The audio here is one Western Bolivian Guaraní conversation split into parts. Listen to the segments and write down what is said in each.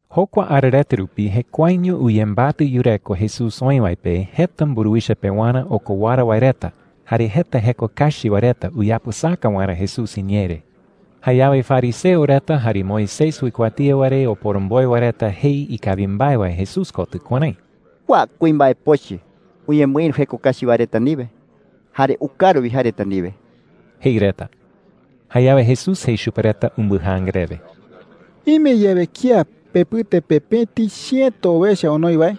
Jokua ara reta rupi jekuaeño uyembatɨ yureko Jesús oï wae pe jeta mburuwicha pewarä okowara wae reta jare jeta jeko kachi wae reta uyapɨsaka waerä Jesús iñee re. Jayawe fariseo reta jare Moisés uikuatía wae re oporomboe wae reta jei ikawi mbae wae Jesús kotɨ kuärái: “Kua kuimbae pochɨ uñemɨïru jeko kachi wae reta ndiwe, jare ukaru wi jae reta ndiwe,” jei reta. Jayawe Jesús jei chupe reta umbɨjaanga rewe: “Ime yawe kía pepɨte pe pëti chiëto owecha onoi wae,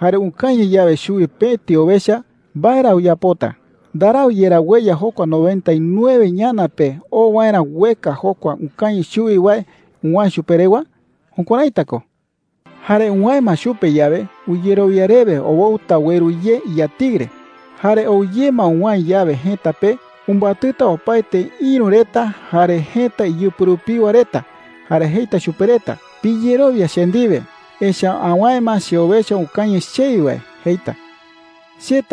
jare ukañɨ yawe chuwi pëti owecha, ¿mbae ra uyapota? ¿Ndarau yerá ueya jokua noventa y nueve ñana pe oo waerä ueka jokua ukañɨ chuwi wae uwäe chupe rewa? Jukuäraita ko,” jei. “Jare uwäe ma chupe yawe, uyerowia rewe owoɨta ueru ye iyatiɨ re. Jare ou ye ma uwäe yawe jëta pe, umbatɨta opaete ïru reta jare jëta iyɨpɨ rupiwa reta, jare jeita chupe reta: ‘Piyerowia che ndiwe, echa’ä awäe ma cheowecha ukañɨ chewi wae,’ jeita,” jei.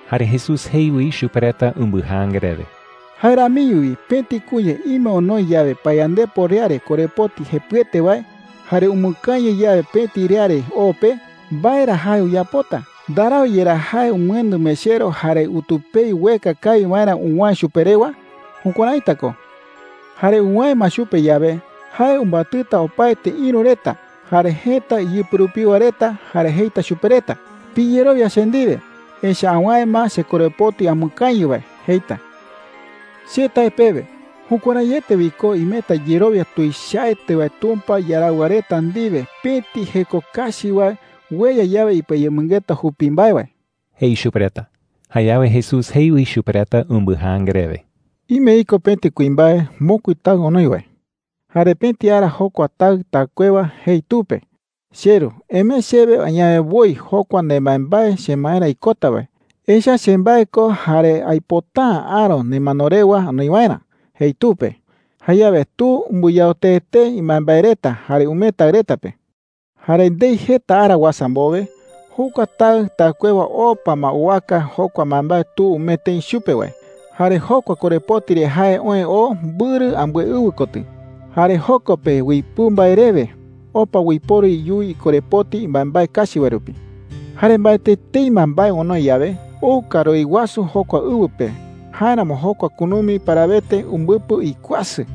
Jare Jesús jei wi chupe reta umbɨjaanga rewe: “Jae ramiño wi pëti kuña ime onoi yawe payandepo riare korepoti jepɨete wae, jare umɨkañɨ yawe pëti riare o pe, ¿mbae ra jae uyapota? ¿Ndarau yerá jae umɨendɨ mechero jare utupei ueka kawi waerä uwäe chupe rewa? Jukuäraita ko,” jei. “Jare uwäe ma chupe yawe, jae umbatɨta opaete ïru reta jare jëta iyɨpɨ rupiwa reta, jare jeita chupe reta: ‘Piyerowia che ndiwe, echa’ä awäe ma chekorepoti amɨkañɨ wae,’ jeita,” jei. “Che tae pewe, jukuäraiete wi ko imeta yerowia tuichaete wae Tumpa iaraɨwa reta ndiwe pëti jeko kachi wae ueya yawe ipɨayemɨngeta jupi mbae wae,” jei chupe reta. Jayawe Jesús jei wi chupe reta umbɨjaanga rewe: “Ime iko pëti kuimbae mokui taɨ onoi wae,” jei. “Jare pëti ara jokua taɨ taɨkuewa jei tu pe: ‘Cheru, emee chewe añawe woi jokua nembaembae chemaerä ikota wae. Echa’ä chembae ko jare aipota’ä aäro nemano rewa anoi waerä,’ jei tu pe. Jayawe tu umbɨyao tee tee imbaembae reta jare umee taɨ reta pe,” jei chupe reta. “Jare ndei jeta ara uasa mbowe, jokua taɨ taɨkuewa opa ma owaka jokua mbaembae tu umee tëi chupe wae. Jare jokua korepoti re jae oë oo mbɨrɨ ambɨe ɨwɨ kotɨ. Jare joko pe uipɨu mbae rewe opa uiporu iyuwi ikorepoti mbaembae kachi wae rupi,” jei. “Jare mbaetɨ etei ma mbae onoi yawe, ou karuái wasu jokua ɨwɨ pe. Jáeramo jokua kunumi parawete umbɨpɨ ikuasɨ.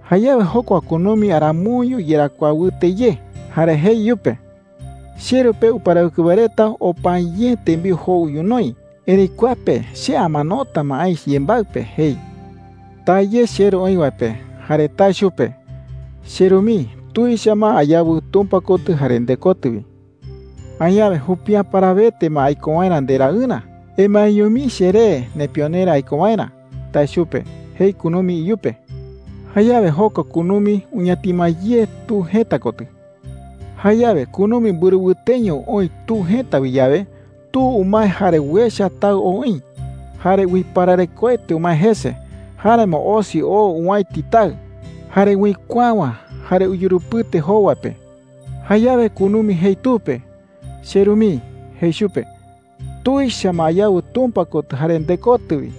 “Jayawe jokua kunumi aramoiño iyarakuaa wɨte ye, jare jei iyupe: ‘Cheru pe uparawɨkɨ wae reta opa’ä ye tembiu jou ñonoï. Erëi kua pe che amanota ma aï yembaɨ pe,’ jei. ‘Taa ye cheru oï wae pe jare tae chupe: ‘Cheru mii, tuicha ma ayawɨ Tumpa kotɨ jare ndekotɨ wi. Añawe jupi’ä parawete ma aiko waerä nderaɨrä. Emaeño mii cheré nepionerä aiko waerä,’ tae chupe,’ jei kunumi iyupe. Jayawe jokua kunumi uñatima ye tu jëta kotɨ,” jei Jesús chupe reta. “Jayawe kunumi mbɨrɨ wɨteño oï tu jëta wi yawe, tu umae jare uecha taɨ ou oï. Jare uipararekoete umae jese. Jáeramo osi oo owäiti taɨ, jare uikuäwa, jare uyurupɨte jowa pe. Jayawe kunumi jei tu pe: ‘Cheru mii,’ jei chupe. ‘Tuicha ma ayawɨ Tumpa kotɨ jare ndekotɨ wi.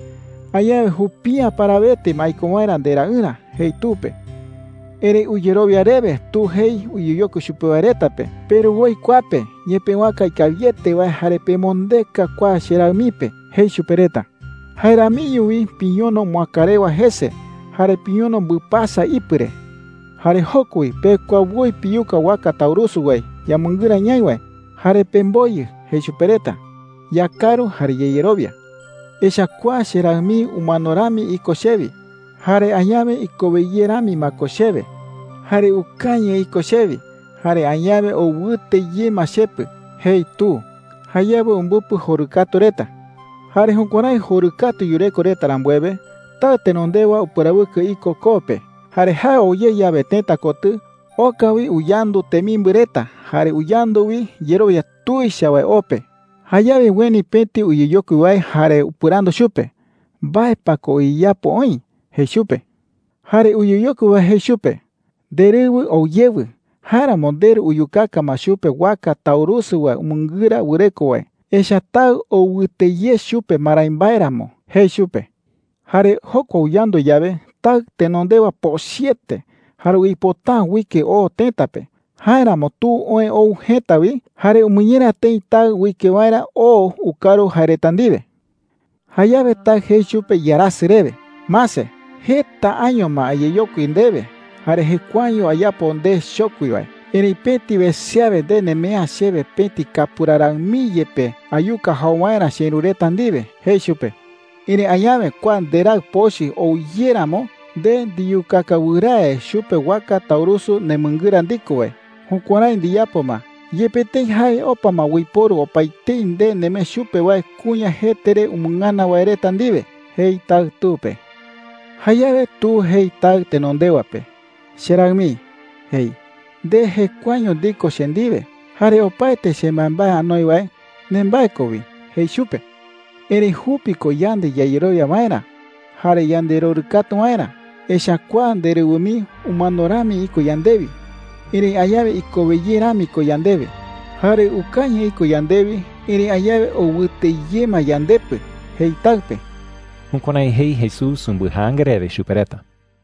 Añawe jupi’ä parawete ma aiko waerä nderaɨrä,’ jei tu pe. “Erëi uyerowia rewe tu jei uyeyokui chupe wae reta pe: ‘Peru woi kua pe ñepëwaka ikawiete wae jare pemondeka kua cheraɨ mii pe,’ jei chupe reta. ‘Jae ramiño wi piñono moäkarewa jese, jare piñono mbɨpasa ipɨ re. Jare joko wi pekua woi piyuka waka taurusu wae yamɨngɨra ñaï wae jare pemboyɨ,’ jei chupe reta. ‘Yakaru jare yayerowia. Echa’ä kua cheraɨ mii umano rami iko chewi, jare añawe ikowe ye rami ma ko chewe. Jare ukañɨ iko chewi, jare añawe ou wɨte ye ma chepɨ,’ jei tu. Jayawe umbɨpɨ jorɨkatu reta,” jei Jesús chupe reta. “Jare jukuärái jorɨkatu yureko reta rambuewe, taɨ tenondewa uparawɨkɨ iko koo pe. Jare jae ou ye yawe tëta kotɨ, oka wi uyandu temimbɨ reta jare uyandu wi yerowia tuicha wae o pe. Jayawe ueni pëti uyeyokui wae jare upɨrandu chupe: “¿Mbae pa ko uyeyapo oï?’ jei chupe. Jare uyeyokui wae jei chupe: ‘Nderɨwɨ ou yewɨ. Jáeramo nderu uyukaka ma chupe waka taurusu wae umɨngɨra wɨreko wae, echa’ä taɨ ou wɨte ye chupe marái mbae ramo,’ jei chupe. “Jare jokua uyandu yawe, taɨ tenondewa pochɨete, jare uipota’ä uike oo tëta pe. Jáeramo tu oë ou jëta wi jare umɨñera tëi taɨ uike waerä oo ukaru jae reta ndiwe,” jei. “Jayawe taɨ jei chupe iarasɨ rewe: ‘Mase. Jeta año ma ayeyokui ndewe jare jekuaeño ayapo nde chokui wae. Erëitu pëti wese awe nde nemee’ä chewe pëti kapura raɨ mii yepe ayuka jau waerä cheïru reta ndiwe,’ jei chupe. ‘Erëi añawe kua nderaɨ pochɨ ou ye ramo, nde ndiyukaka wɨrae chupe waka taurusu nemɨngɨra ndiko wae. Jukuärái ndiyapo ma, yepe tëi jae opa ma uiporu opaetei nde nemee chupe wae kuña jete re umɨngana wae reta ndiwe,’ jei taɨ tu pe. Jayawe tu jei taɨ tenondewa pe: ‘Cheraɨ mii,’ jei. ‘Nde jekuaeño ndiko che ndiwe. Jare opaete chembaembae anoi wae, nembae ko wi,’ jei chupe. ‘Erëi jupi ko yande yayerowia waerä jare yanderorɨkatu waerä. Echa’ä kua nderɨwɨ mii umano rami iko yandewi, erëi añawe ikowe ye rami ko yandewe. Jare ukañɨ iko yandewi, erëi añawe ou wɨte ye ma yandepɨ,’ jei taɨ pe.” Jukuärái jei Jesús umbɨjaanga rewe chupe reta.